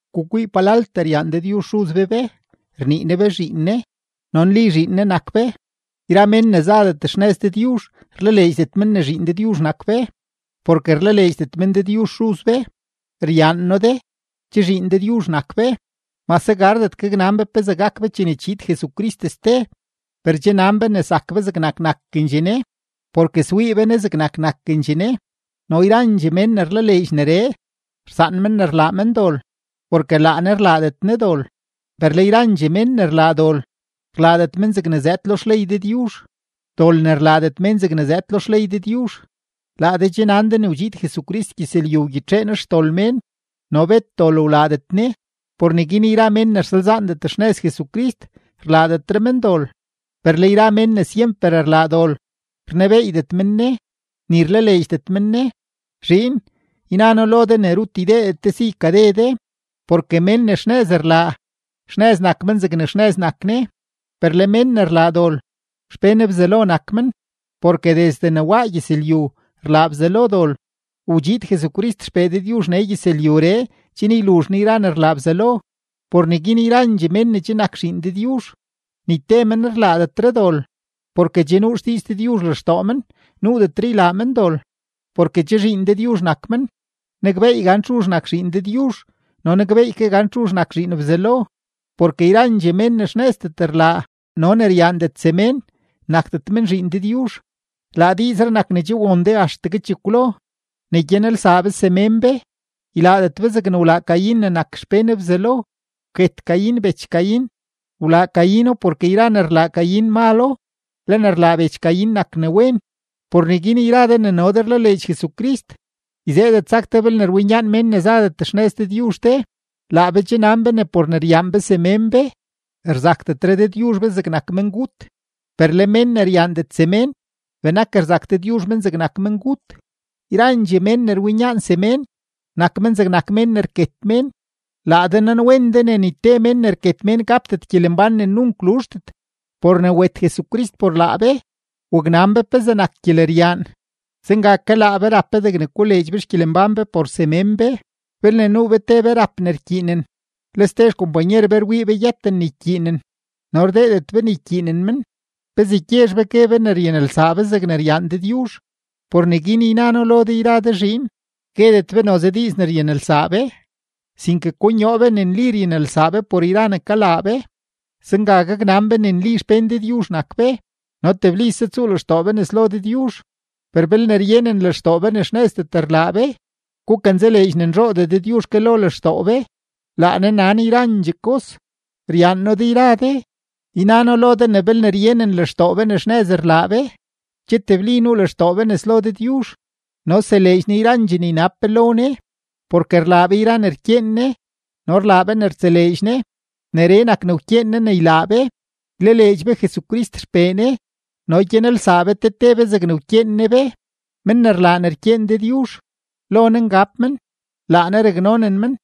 Gukwii palaltee ryaan Dëdyuzh Xuz be be, rnii Ne be zhiin Ne, no nli zhiin Ne nak be. Yra mén ne zadet xnëz Dëdyuzh, rlaleedxdet men ne zhiin Dëdyuzh nak be, porke rlaleedxdet men Dëdyuzh Xuz be. Ryaan noo de, che zhiin Dëdyuzh nak be; mase gardet gaknan be gan pezee gak be chene chiid Jesucrist ste, per che nan be ne zak be zegnak nakendxee Ne, porke swii be Ne zegnak nakendxee Ne. No yrandxee mén ne rlaleedx neree, rsaan men ne rlaa men dol, porke laa Ne rlaadet Ne dol. Per le yrandxee mén ne rlaa dol, rlaadet men zegne zëëd lo xley Dëdyuzh; dol ne rlaadet mén zegne zëëd lo xley Dëdyuzh. Laa de che nan de ne wdxiid Jesucrist gyëzlyu wgyitxee Ne xdol mén, no bet dol wlaadet Ne. Por neguin yra mén ne rsalzaandet xnëz Jesucrist, rlaadetre men dol. Per le yra mén ne syemper rlaa dol, rnebeeydet men Ne, ni rlaleedxdet men Ne. Zhiin, yna noo lo de ne rut ydeedet de si ykade de, porke mén ne xnëz rlaa, xnëz nak men zegne xnëz nak Ne. Per le mén ne rlaa dol, xpén Bzelo nak men, porke desde ne waa gyëzlyu rlaa Bzelo dol. Wdxiid Jesucrist XPee Dëdyuzh nee gyëzlyuree chen yluzh Ne yra ne rlaa Bzelo. Por neguin yrandxee mén ne che nak zhiin Dëdyuzh, ni te men rlaadetre dol, porke che nuu xdiiz Dëdyuzh lextoo men, nuudetre ylaa men dol, porke che zhiin Dëdyuzh nak men. Nakbeey gan txuzh nak zhiin Dëdyuzh no nakbeey ke gan txuzh nak zhiin Bzelo, porke yrandxee mén ne xnëzdet rlaa no ne ryaandet semén, nakdet men zhiin Dëdyuzh. Laa diizree nak ne che won de axtegue chekwlo: ne gyanelsaa be semén be. Ylaadet be zegne wlaa Caín ne nak xpén Bzelo, wket Caín bech Caín. Wlaa Caíno, porke yra ne rlaa Caín malo, le ne rlaa bech Caín nak ne wen. Por neguin yra de ne no de rlaleedx Jesucrist, yzeedet sak de belne rwinyaan mén ne zadet xnëz Dëdyuzh de. Laa be che nan be ne por ne ryaan be semén be, rzakdetre Dëdyuzh be zegnak mengut. Per le mén ne ryaandet semén, benak rzak Dëdyuzh men zegnak mengut. Yrandxee mén ne rwinyaan semén, nak men zegnak mén ne rket mén. Laa de nanwen de ne ni te mén ne rket mén gapdet gyelembán ne nunk luzhdet. Por ne wet Jesucrist por laa be, waknan be pezee nak gyeleryaan. Zenga ke laa be rap be degne koleedx be xgyelembán be por semén be. Belne nuu be te be rap ne rkyiinen, le ste xkompanyer be rwii be yëten ne ykyiinen no rdeedet be ne ykyiinen men, ¿pezee gyezh be gue be ne ryanelsaa be zegne ryaan Dëdyuzh? Por neguin yna noo lo de yra de zhiin, guedet be noze diiz ne ryanelsaa be, sinke konyoo be ne nli ryanelsaa be por yra ne kalaa be. Zenga gaknan be ne nli xpén Dëdyuzh nak be no teblise tsuu lextoo be nes lo Dëdyuzh. Per belne ryenen lextoo be ne xnëzdet rlaa be, gukanzaleedx ne nzhoodee Dëdyuzh ke lo lextoo be; laa Ne nan yrandxee kos. Ryaan noo de yra de; yna noo lo de ne belne ryenen lextoo be ne xnëz rlaa be, che tebli nuu lextoo be nes lo Dëdyuzh. No seleedx Ne yrandxee ne ynab be lo Ne, porke rlaa be yra ne rkyeen Ne no rlaa be ne rtseleedx Ne. Neree nak ne wkyeen Ne ne ylaa be: ylaleedx be Jesucrist XPee Ne no gyanelsaa be te te be zegne wkyeen Ne be. Men ne rlaa ne rkyeen Dëdyuzh, lo Ne ngab men, laa Ne raknonen men.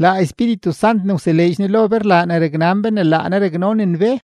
Laa Espíritu Sant ne wseleedx Ne lo be rlaa ne raknan be ne laa Ne raknonen be.